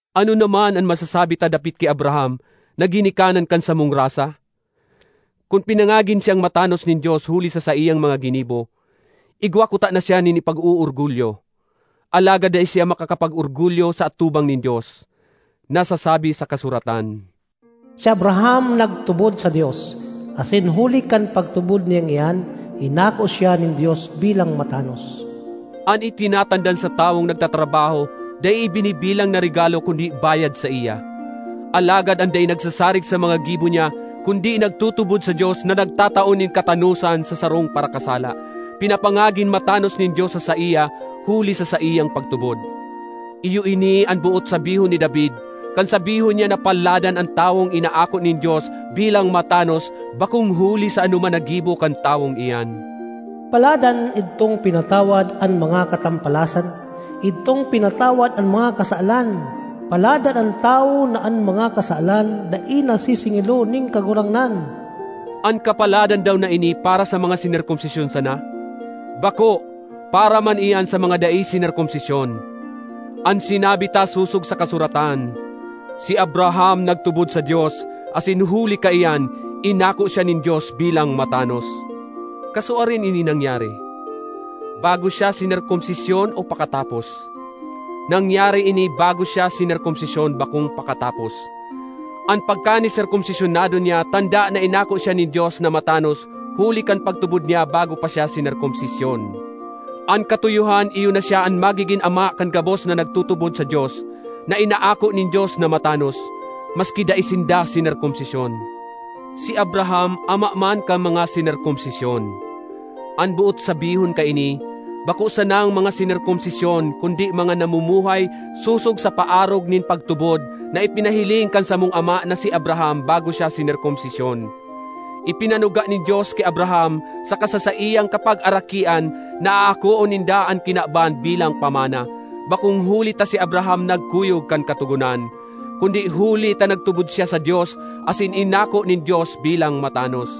Ano naman an masasabi ta dapit ki Abraham na ginikanan kan samong rasa? Kun pinangagin siyang matanos nin Dios huli sa saiyang mga ginibo, igwa kutana siya nin ipag-oorgulyo. Alagad dai siya makakapag-orgulyo sa atubang nin Dios. Nasasabi sa kasuratan, “Si Abraham nagtubod sa Dios, asin huli kan pagtubod niyang iyan, inako siya nin Dios bilang matanos.” An itinatandan sa tawong nagtatrabaho dai ibinibilang na regalo kundi bayad saiya. Alagad an dai nagsasarig sa mga gibo niya, kundi nagtutubod sa Dios na nagtatao nin katanosan sa sarong parakasala, pinapangagin matanos nin Dios sa saiya huli sa saiyang pagtubod. Iyo ini an boot sabihon ni David kan sabihon niya na paladan an tawong inaako nin Dios bilang matanos bakong huli sa anoman na gibo kan tawong iyan: ”Paladan idtong pinatawad an mga katampalasan; idtong pinatawad an mga kasalan! Paladan an tawo na an mga kasalan dai na sisingilon nin Kagurangnan!” An kapaladan daw na ini para sa mga sinerkomsisyon sana? Bako! Para man iyan sa mga dai sinerkomsisyon. An sinabi ta sosog sa kasuratan, “Si Abraham nagtubod sa Dios, asin huli kaiyan inako siya nin Dios bilang matanos.” Kasuarin ini nangyari? Bago siya sinerkomsisyon o pakatapos? Nangyari ini bago siya sinerkomsisyon, bakong pakatapos. An pagkaniserkomsisyonado niya tanda na inako siya nin Dios na matanos huli kan pagtubod niya bago pa siya sinerkomsisyon. An katuyohan iyo na siya an magigin ama kan gabos na nagtutubod sa Dios na inaako nin Dios na matanos, maski dai sinda sinerkomsisyon. Si Abraham ama man kan mga sinerkomsisyon; an boot sabihon kaini, bako sanang mga sinerkomsisyon kundi mga namumuhay sosog sa paarog nin pagtubod na ipinahiling kan samong ama na si Abraham bago siya sinerkomsisyon. Ipinanuga nin Dios ki Abraham saka sa saiyang kapagarakian na aakoon ninda an kinaban bilang pamana, bakong huli ta si Abraham nagkuyog kan Katogonan, kundi huli ta nagtubod siya sa Dios asin inako nin Dios bilang matanos.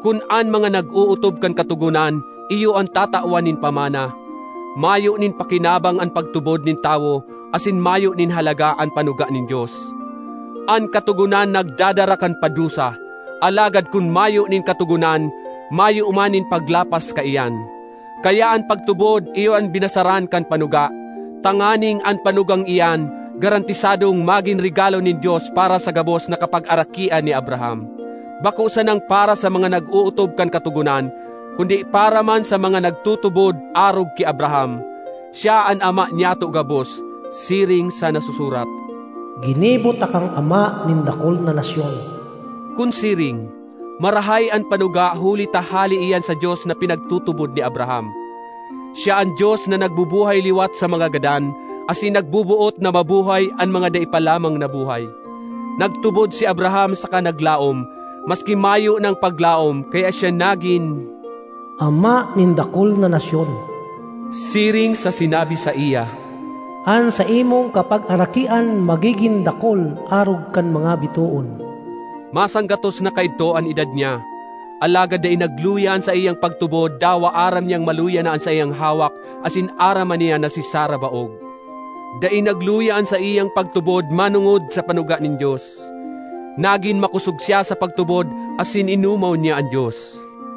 Kun an mga nag-ootob kan Katogonan iyo an tatawan nin pamana, mayo nin pakinabang an pagtubod nin tawo asin mayo nin halaga an panuga nin Dios. An Katogonan nagdadara kan padusa; alagad kun mayo nin katogonan, mayo man nin paglapas kaiyan. Kaya an pagtubod iyo an binasaran kan panuga, tanganing an panugang iyan garantisadong magin regalo nin Dios para sa gabos na kapagarakian ni Abraham—bako sanang para sa mga nag-ootob kan Katogonan, kundi para man sa mga nagtutubod arog ki Abraham. Siya an ama nyato gabos, siring sa nasusurat, “Ginibo takang ama nin dakul na nasyon.” Kun siring, marahay an panuga huli ta hale iyan sa Dios na pinagtutubod ni Abraham—siya an Dios na nagbubuhay liwat sa mga gadan asin nagboboot na mabuhay an mga dai pa lamang nabuhay. Nagtubod si Abraham saka naglaom, maski mayo nang paglaom, kaya siya nagin “ama nin dakul na nasyon.” Siring sa sinabi saiya, “An saimong kapagarakian magigin dakul arog kan mga bitoon.” Masanggatos na kaidto an edad niya, alagad dai nagluya an saiyang pagtubod, dawa aram niyang maluya na an saiyang hawak asin aram man niya na si Sara baog. Dai nagluya an saiyang pagtubod manongod sa panuga nin Dios. Nagin makosog siya sa pagtubod asin inomaw niya an Dios.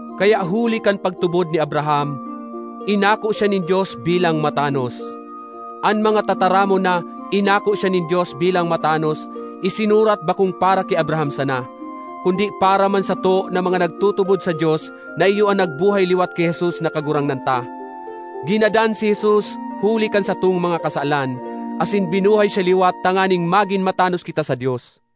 Kaya huli kan pagtubod ni Abraham, “inako siya nin Dios bilang matanos.” An mga tataramon na “inako siya nin Dios bilang matanos” isinurat bakong para ki Abraham sana, kundi para man sato na mga nagtutubod sa Dios na iyo an nagbuhay liwat ki Jesus na Kagurangnan ta. Ginadan si Jesus huli kan satong mga kasalan, asin binuhay siya liwat tanganing magin matanos kita sa Dios.